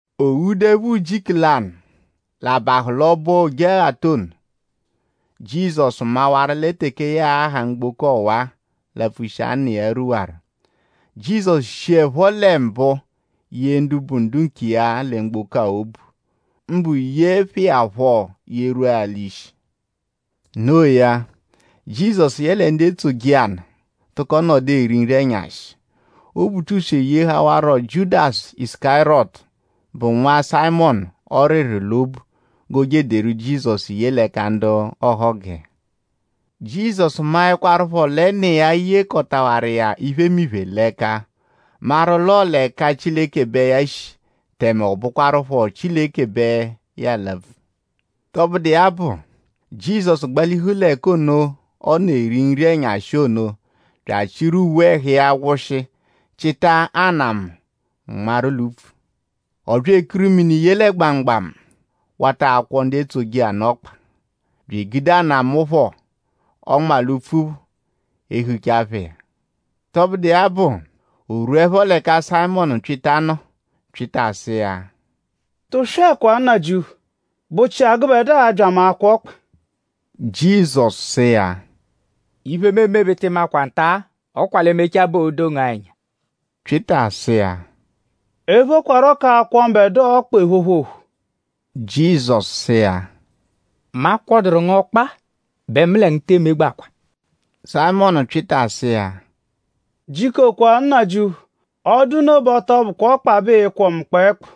O ghuduẹpho ujiku lanụ; l'a bahụ l'ọbo Ojeghata ono; Jizọsu mawaru lẹ teke ya a-ha mgboko ọwa; lapfushia Nna iya rwuwaru. Jizọsu shiẹpho lẹ mbụ yee ndu bụ ndu nkiya lẹ mgboko-a obu; mbụ yeẹ phẹ iya phọ yerwua l'ishi. Noo ya; Jizọsu yẹle ndu etsoje iya nụ tụko nọdu eri nri-ẹnyashi. Obutuswe yehawarụro Jiudasu Isukariyọtu, bụ nwa Sayịmonu ọriri l'obu g'o je ederu Jizọsu ye l'ẹka ndu ọhogu iya. Jizọsu maẹkwarupho lẹ Nna iya yekọtaru iya iphemiphe l'ẹka; maru l'ọo l'ẹka Chileke bẹ ya shi; tẹme ọ bụkwarupho Chileke bẹ ya alapfu. Tọbudu iya bụ; Jizọsu gbalihu l'ẹka ọ nọ eri nri-ẹnyashi ono bya achịru uwe ẹhu iya wụshi; chịta anamụ nmarụ l'upfu. Ọ bya ekuru mini ye lẹ gbamugbamu wata akwọ ndu etsoje iya nụ ọkpa; bya egude anamụ phọ, ọ nma l'upfu phọ ehucha phẹ iya. Tọbudu iya bụ; o -rwuẹpho l'ẹka Sayịmonu Pyịta nọ; Pyịta sụ iya: “Tụswekwa! Nnajịuphu!?Bụchia gụbedua abya mu akwọ ọkpa?” Jizọsu sụ iya: “Iphe, mu eme bẹ ị tị makwa nta-a. Ọ kwa l'e mechaa bẹ oo-do ngu-a ẹnya.” Pyịta sụ iya: “Ephokwarọ k'akwọ mbẹdua ọkpa ephopho ophu.” Jizọsu sụ iya: “Mu akwọduru ngu ọkpa bẹ mu lẹ ngu tee megbakwa.” Sayịmonu Pyịta sụ iya: “Jikokwa! Nnajịuphu! Ọ -dụ nno bẹ ọ tọ bụkwaa ọkpa bẹ ịi-kwọ mu kpẹekpu;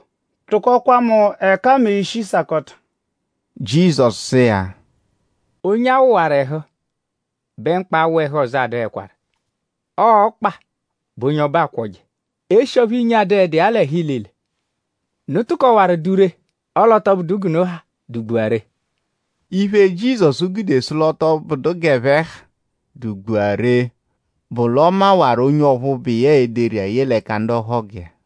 tụkokwa mu ẹka mẹ ishi sakọta.” Jizọsu sụ iya: “Onye a wụwaru ẹhu bẹ mkpa awụ ẹhu ọzo adụhekwaru. Ọo ọkpa bẹ onye ọbu akwọje eshi ọphu inyi adụhedu iya l'ẹhu ilile. Unu tụkowaru dụ ree; ọle ọ tọ bụdu g'unu ha dụ-gbua ree.” Iphe, Jizọsu gude sụ l'ọ tọ bụdu g'ẹphe ha dụ-gbua ree bụ l'ọ mawaru onye ọphu bụ iya e-deru iya ye l'ẹka ndu ọhogu iya.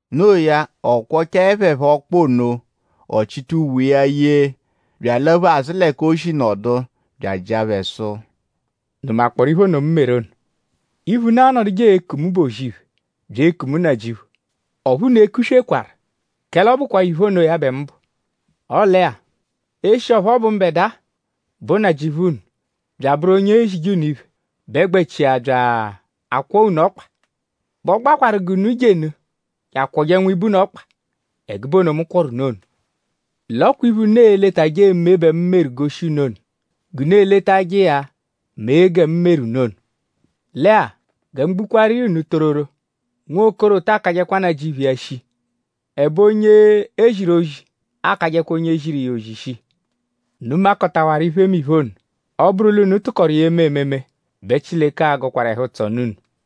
No iya; ọ kwọchae phẹ phọ ọkpa ono; ọ chịta uwe ẹhu iya yee bya alaphu azụ l'ẹka o shi nọdu bya ajịa phẹ sụ: “?Unu makpọoru iphe ono, mu meru unu ono? Iphe, unu anọduje eku mu bụ ‘O-zì-iphe’ bya eku mu ‘Nnajịuphu’. Ọphu unu ekuswekwaru; kẹle ọ bụkwaa iphe onoya bẹ mu bụ. Ọle-a; eshi ọphu ọ bụ mbẹdua, bụ Nnajịuphu unu bya abụru onye ezije unu iphe bẹ gbẹchia bya akwọo unu ọkpa; bẹ ọ gbakwarụ g'unu jenụ je akwọje nwibe unu ọkpa ẹgube ono, mu kwọru unu ono. L'ọ kwa iphe, unu e-letajẹ eme bẹ mu meru goshi unu ono; g'unu eletajẹ iya mee gẹ mu meru unu ono. Lẹ-a; gẹ mu gbukwaaru iya unu tororo; nwokoro ta akajẹkwa nnajịuphu iya shii; ẹbe onye e ziru ozi akajẹkwa onye ziru iya ozi shii. Unu makọtawaru iphemiphe ono. Ọ -bụru l'unu tụkoru iya eme ememe bẹ Chileke a-gọkwaru ẹhu-ụtso nụ unu.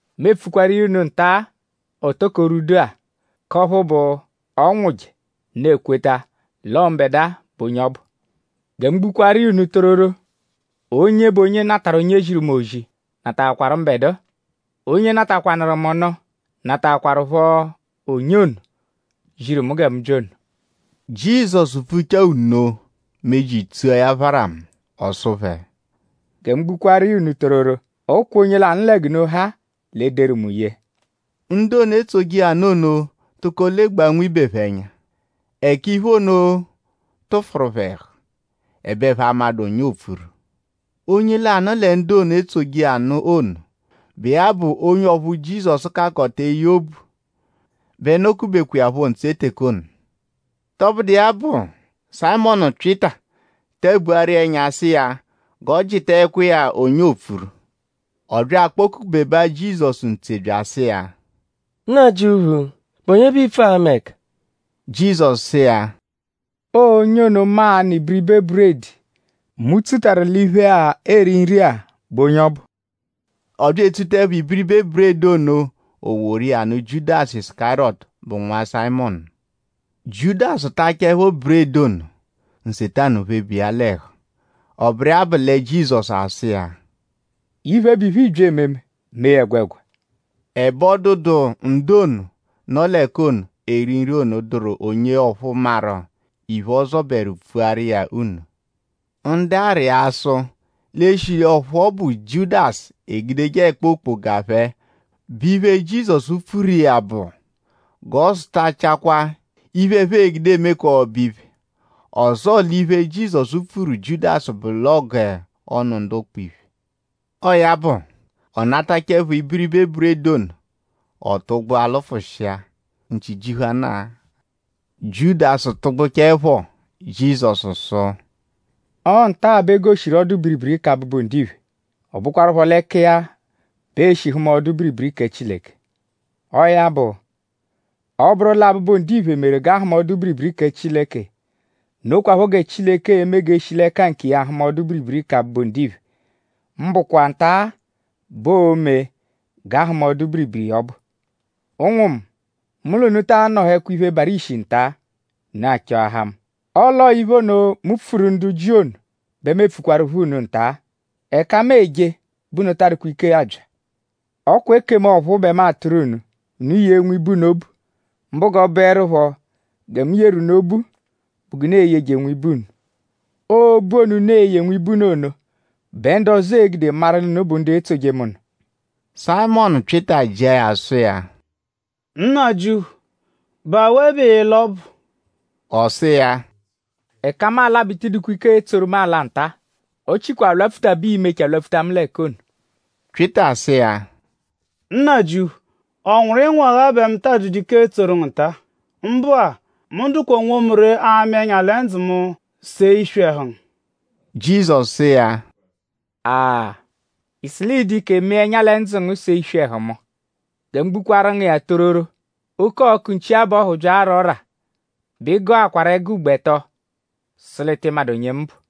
Mu epfukwaru iya unu nta-a, o toko rwudu-a; k'ọphu bụ; ọ -nwụje; unu ekweta l'ọo mbẹdua bụ onye ọbu. Gẹ mu gbukwaaru iya unu tororo; onye bụ onye natarụ onye mu ziru ozi nataakwaru mbẹdua. Onye natakwanụru mu nụ nataakwarụpho onye ono, ziru mu gẹ mu bya ono.” Jizọsu pfuchaa nno; meji tsua ya pharamu. Ọ sụ phẹ: “Gẹ mu gbukwaaru iya unu tororo; ọ kwa onye lanụ lẹ g'unu ha-a l'e-deru mu ye.” Ndu ono, etsoje iya nụ ono tụko legbaa nwibe phẹ ẹnya; ẹka iphe ono tụfuru phẹ ẹhu; ẹbe ẹphe amadụ onye oopfuru. Onye lanụ lẹ ndu ono, etsoje iya nụ ono, bụ iya bụ onye ọphu Jizọsu kakọta eye obu bẹ nọ-kubekwa iya phọ ntse teke ono. Tọbudu iya bụ; Sayịmonu Pyịta tabuaru iya ẹnya sụ iya g'ọ jịtaekwa iya onye oopfuru. Ọ bya akpọ-kubebaa Jizọsu ntse bya asụ iya: “Nnajịuphu!?Bụ onye bẹ iipfu ama ẹka?” Jizọsu sụ iya: “Ọo onye ono, mu a-nụ ibiribe buredi, mu tsutarụ l'iphe-a, eeri nri-a bụ onye ọbu.” Ọ bya etsutaẹpho ibiribe buredi ono; o woru iya nụ Jiudasu Isukariyọtu, bụ nwa Sayịmonu. Jiudasu tachaẹpho buredi ono; Nsetanu pheba iya l'ẹhu. Ọ bụru iya bụ lẹ Jizọsu asụ iya: “Iphe, bụ iphe, ịibya ememe mee ya ẹgwegwa.” Ẹbe ọ dụdu ndu ono, nọ l'ẹka ono, eeri nri ono, dụru onye ọphu maru iphe, ọ zọberu pfuaru iya nno. Ndu arịa sụ l'eshi ọphu ọ bụ Jiudasu, l'egudeje ẹkpa okpoga phẹ bụ iphe, Jizọsu epfuru iya bụ g'ọ zụtachakwaa iphe, ẹphe gude eme k'ọbo-iphe; ọzoo l'iphe, Jizọsu pfuru Jiudasu bụ g'ọ nụ ndu ụkpa iphe. Ọo ya bụ; ọ natachaẹpho ibiribe buredi ono; ọ tụgbua lụfushia; nchi jihuanaa. Jiudasu tụgbuchaepho; Jizọsu sụ: “Ọo nta-a bẹ e goshiru ọdu-biribiri kẹ Abụbu-Ndiphe. Ọ bụkwarupho l'ẹka iya bẹ ee-shi hụma ọdu-biribiri kẹ Chileke. Ọo ya bụ; ọ -bụru lẹ Abụbu-Ndiphe meru g'a hụma ọdu-biribiri kẹ Chileke; nokwaphọ gẹ Chileke e-me g'e shi l'ẹka nkiya hụma ọdu-biribiri kẹ Abụbu-Ndiphe; mbụkwa nta-a bẹ oo-me g'a hụma ọdu-biribiri iya ọbu. Ụnwu mu! Mu l'unu ta anọhekwa iphe, barụ ishi nta-a; unu achọahaa mu. Ọle ọo iphe ono, mu pfuru ndu Jiu ono bẹ mu epfukwarụpho unu nta-a. ‘Ẹka mu eje bẹ unu taa dụkwa ike abya.’ Ọ kwa ekemu ọ̀phúú bẹ mu atụru unu. Unu yee nwibe unu obu; mbụ g'ọ bụerupho gẹ mu yeru unu obu bụ g'unu e-yeje nwibe unu. Ọo obu ono, unu e-ye nwibe unu ono bẹ ndu ọzo e-gude maru l'unu bụ ndu etsoje mu nụ.” Sayịmonu Pyịta jịa ya sụ iya: “Nnajịuphu;?bụ awe bẹ ịila ọbu?” Ọ sụ iya: “Ẹka mu ala bẹ ị tịi dụkwa ike etsoru mu ala nta. Ọ chikwa alwapfuta bẹ ii-mechaa lwapfuta mu l'ẹka ono.” Pyịta sụ iya: “Nnajịuphu;?ọ nwụru ịnwu-agha bẹ mu taa dụdu ike etsoru ngu nta-a? Mbụ-a; mu dụkwaa onwomu ree amị ẹnya lẹ ndzụ mu see iswi ẹhu ngu.” Jizọsu sụ iya: “Aa!?Ị sụ l'ịi-dụ ike mịa ẹnya lẹ ndzụ ngu see iswi ẹhu mu? Gẹ mu gbukwaaru ngu iya tororo; oke-ọku nchi-abọhu -bya ara ọ́rà; bẹ ị gọakwaru ẹgo ugbo ẹto sụ l'ị tị madụ onye mu bụ.”